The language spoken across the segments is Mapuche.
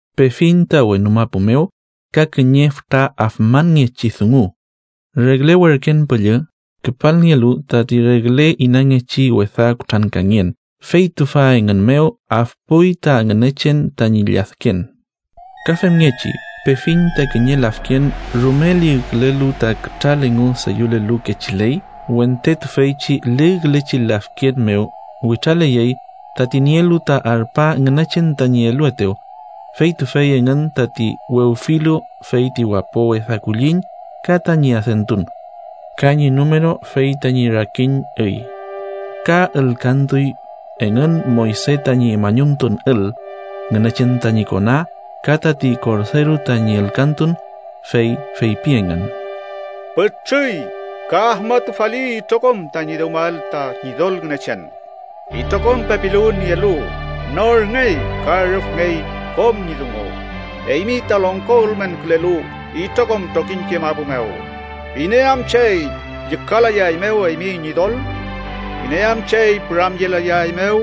Pefiñ ta wenu mapu mew ka kiñe fütra afmanngechi dungu: regle werken püllü, küpalnielu tati regle inangechi wesa kutrankangen, fey tüfa engün mew afpuy ta Ngünechen tañi lladken. Ka femngechi pefiñ ta kiñe lafken rume ligkülelu ta kütral engu deyülelu kechiley. Wente tüfeychi ligkülechi lafken mew witraleyey, tati nielu ta arpa Ngünechen tañi eluetew, fey tüfey engün tati wewfilu fey ti wapo wesa kulliñ ka tañi adentun, ka ñi numeru fey tañi rakin üy. Ka ülkantuy engün Moyse tañi mañumtun ül, Ngünechen tañi kona, ka tati Korderu tañi ülkantun. Fey feypi engün: “Pütrüy ka afmatufali itrokom tañi dewmael ta Ñidol Ngünechen itrokom pepiluwün nielu, norngey ka rüfngey kom ñi dungu, eymi ta longko ülmenkülelu itrokom trokiñke mapu mew. ¿Iney am chey llükalayaeymew eymi Ñidol? ¿Iney am chey püramyelayaeymew?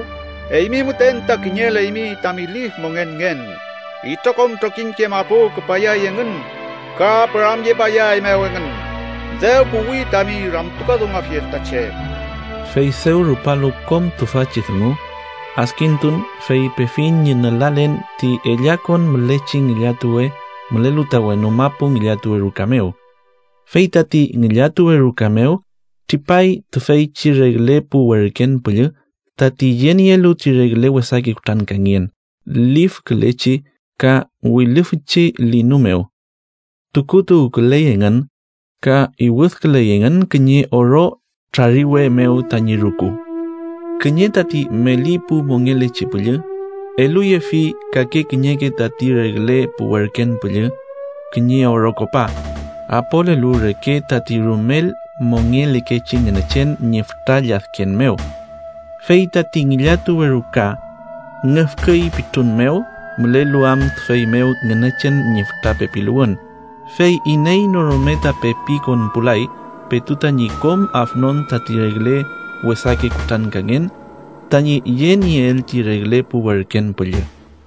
Eymi müten ta kiñeleymi tami lif mongenngen. Itrokom trokiñke mapu küpayay engün ka püramyepayaeymew engün, dew puwi tami ramtukadunguafiel ta che.” Fey dew rupalu kom tüfachi dungu, adkintun, fey pefiñ ñi nülalen ti ellakon mülechi ngillatuwe mülelu ta wenu mapu ngillatuwe ruka mew. Fey tati ngillatuwe ruka mew tripay tüfeychi regle pu werken püllü tati yenielu ti regle wesake kutrankangen. Lifkülechi ka wilüfüchi linu mew tukutuwküley engün, ka iwüdküley engün kiñe oro trariwe mew tañi rüku. Kiñe tati meli pu mongelechi püllü eluyefi kake kiñeke tati regle pu werken püllü kiñe oro kopa, apolelu reke tati rumel mongelekechi Ngünechen ñi fütra lladken mew. Fey tati ngillatuwe ruka ngüfküy pitrun mew mülelu am tüfey mew Ngünechen ñi fütra pepiluwün, fey iney no rume ta pepi konpulay petu tañi kom afnon tati regle wesake kutrankangen tañi yenieel ti regle pu werken püllü.